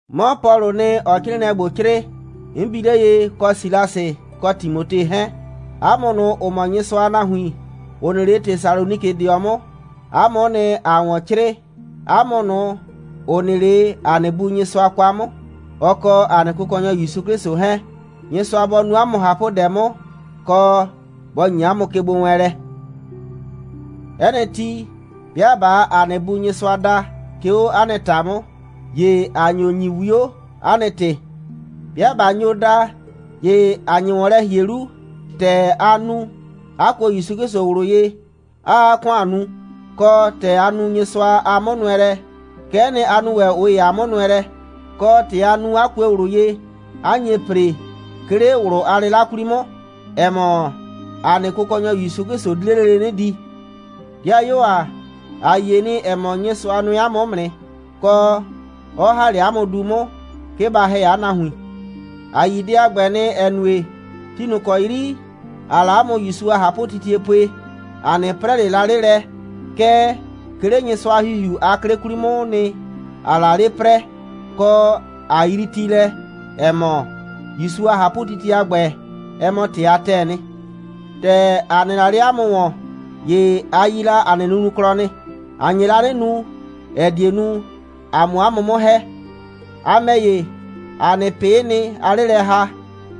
'Mɔ Pɔlʋʋ nɩ, ‑ɔɔ 'crɩɩnɩɛ ‑gbo 'crɩɩ, 'n bi 'le ye, kɔ Silasɩ kɔ Timote 'hɛɛn. 'A mʋ ꞊nʋ, ‑ʋ mɔ Nyɩsʋa a nahuin, ‑ʋ nɩ 'le Tesalonikɩdɩɔ 'mʋ, 'a mʋ'ʋ nɩ, ‑aa ‑wɔn 'crɩɩ, 'a mʋ ꞊nʋ, ‑ʋ nɩ 'le ‑a nɩ Bu Nyɩsʋa kwa 'mʋ, ɔ kɔ ‑a nɩ Kʋkɔnyɔ ‑Yusu 'Klɩsʋ 'hɛɛn. Nyɩsʋa bɔ nu 'a mʋ ꞊hapʋdɛ 'mʋ, kɔ, bɔ ‑nyi 'a mʋ kegbowɛɛnlɛ. 'Ɛ nɩ ti, 'bɩa ꞊baa ‑a nɩ Bu Nyɩsʋa da, 'ke 'o 'a nɩ ‑ta 'mʋ, ‑ye ‑a nyo ‑nyi 'wio, 'a nɩ ‑tɩ. 'Bɩa ꞊ba nyo da, ‑ye ‑a nye ‑wɔn lɛ ‑hie 'lu, ‑tɛ a nu, 'a kuo ‑Yusu 'Klɩsʋ ꞊wlʋ ye, 'aa 'a ‑kʋan nu, kɔ, ‑tɛ a nu Nyɩsʋa a 'mʋnʋɛlɛ, kɛ'ɛ nɩ, a nu ‑wɛ ꞊ʋ ‑ye a 'mʋnʋɛlɛ, kɔ, ‑tɛ a nu, 'a kue ꞊wlʋ ye, 'a nye ‑pre, 'ke 'le ꞊wlʋ a 'lɩla 'kwli 'mʋ, ‑ɛ mɔ, ‑a nɩ Kʋkɔnyɔ ‑Yusu 'Klɩsʋ di 'le lele 'nɩ di. 'Dɩayuo ‑a, ‑a yie nɩ, ‑ɛ mɔ, Nyɩsʋa nʋɛ 'a mʋ 'mʋ nɩ, kɔ, 'ɔ ‑ha 'le 'a mʋ du 'mʋ, 'ke ba ‑hɛ 'a nahuin. ‑A yi dɛ a ‑gbɛ nɩ, ‑ɛ nue, ti ꞊nʋ ‑kɔ 'yri ‑aa la 'a mʋ ‑Yusu a ꞊hapʋtitie pue, ‑a 'nɩ 'prɛ ꞊le la 'le lɛ, kɛɛ, 'ke 'le Nyɩsʋa a ‑Hihiu a 'klɩ 'kwli 'mʋʋ nɩ, ‑aa la 'le 'prɛɛ, kɔ, ꞊a yrii ti lɛ, ‑ɛ mɔ, ‑Yusu a ꞊hapʋtitie a ‑gbɛ, ɛ mɔ ‑tɩ a ‑tɛɛ nɩ. ‑Tɛ ‑a nɩ la 'le 'a mʋ ‑wɔn, ‑ye a yi la ‑a nɩ nunuklɔ nɩ. ‑A nye la 'nɩ nu, ‑ɛ die nu, ‑a 'mʋ 'a mʋ 'mʋ ‑hɛ. A ‑mɛ ‑ye, ‑a nɩ ꞊pɩ'ɩ nɩ, aa 'le lɛ ‑ha,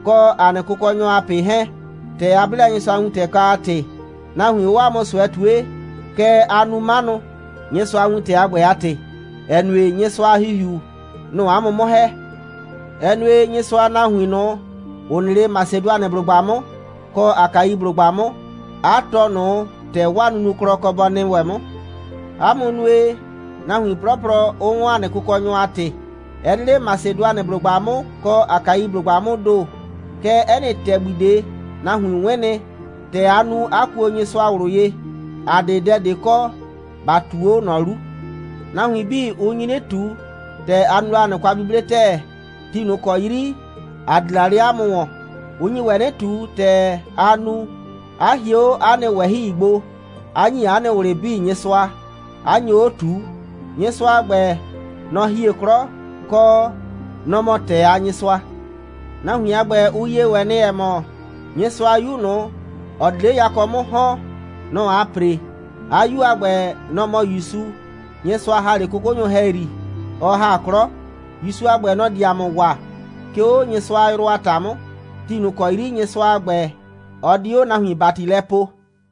kɔ ‑a nɩ Kʋkɔnyɔ a ꞊pɩ 'hɛɛn. ‑Tɛ a 'ble la Nyɩsʋa a wintɛ kwa a ‑tɩ, nahuin 'ʋʋ 'a mʋ ꞊sʋɛ ꞊tue, kɛɛ, aa nu 'manʋ, Nyɩsʋa a wintɛ a ‑gbɛ a ‑tɩ, ‑ɛ nue, Nyɩsʋa a ‑Hihiu, nʋ‑ʋ 'a mʋ 'mʋ ‑hɛ. Ɛ nue, Nyɩsʋa a nahuin ꞊nʋ, ‑ʋ nɩ 'le Masedʋanɩblʋgba 'mʋ kɔ Akaiblʋgba 'mʋ, 'a tɔɔ ꞊nʋ ‑tɛ 'waa nunuklɔ kɔ bɔ nɩ ‑wɛ 'mʋ. 'A mʋ nue, nahuin 'plɔplɔ 'ʋ 'wɔn ‑a nɩ Kʋkɔnyɔ a ‑tɩ. Ɛ 'de 'le Masedʋanɩblʋgba 'mʋ kɔ Akaiblʋgba 'mʋʋ ‑do, kɛɛ, 'ɛ nɩ ‑tɛgbi ꞊de, nahuin 'wɩn nɩ, ‑tɛ a nu, 'a kuo Nyɩsʋa ꞊wlʋ ye. ‑A 'de dɛ ꞊de kɔ, ‑ba ꞊tu 'o ꞊nɔ 'lu. Nahuin 'bii, ʋ nyi 'nɩ ꞊tu, ‑tɛ a nu la ‑a nɩ kwa'buble ‑tɛɛ, ti ꞊nʋ ‑kɔ 'yri ‑a di la 'le 'a mʋ ‑wɔn. Ʋ nyi ‑wɛ 'nɩ ꞊tu, ‑tɛ a nu, 'a hie 'o 'a nɩ ꞊wɛhɩi gbo, 'a ‑nyi 'a nɩ ꞊wlɩ 'bii Nyɩsʋa, 'a nyo 'o ꞊tuu. Nyɩsʋa a ‑gbɛ, nɔ‑ hie 'klɔ, kɔ, nɔ‑ mɔ ‑tɛɛ a Nyɩsʋa. Nahuin a ‑gbɛ, ʋ yie ‑wɛ nɩ, ‑ɛ mɔ, Nyɩsʋa a 'Yu ꞊nʋ, ‑ɔ di 'le yakɔ 'mʋ ‑hɔn, nɔ‑ aa ‑pre. 'A 'Yu a ‑gbɛ, nɔ‑ mɔ ‑Yusu, Nyɩsʋa ‑ha 'le 'kʋkʋnyʋ ‑hɛyri, ɔ ‑ha 'klɔ. ‑Yusu a ‑gbɛ, nɔ‑ di ‑a mʋ waa, 'ke 'o Nyɩsʋa a yrʋ a ‑ta 'mʋ, ti ꞊nʋ ‑kɔ 'yri Nyɩsʋa a ‑gbɛ, ɔ di 'o nahuin ‑bati lɛ poo.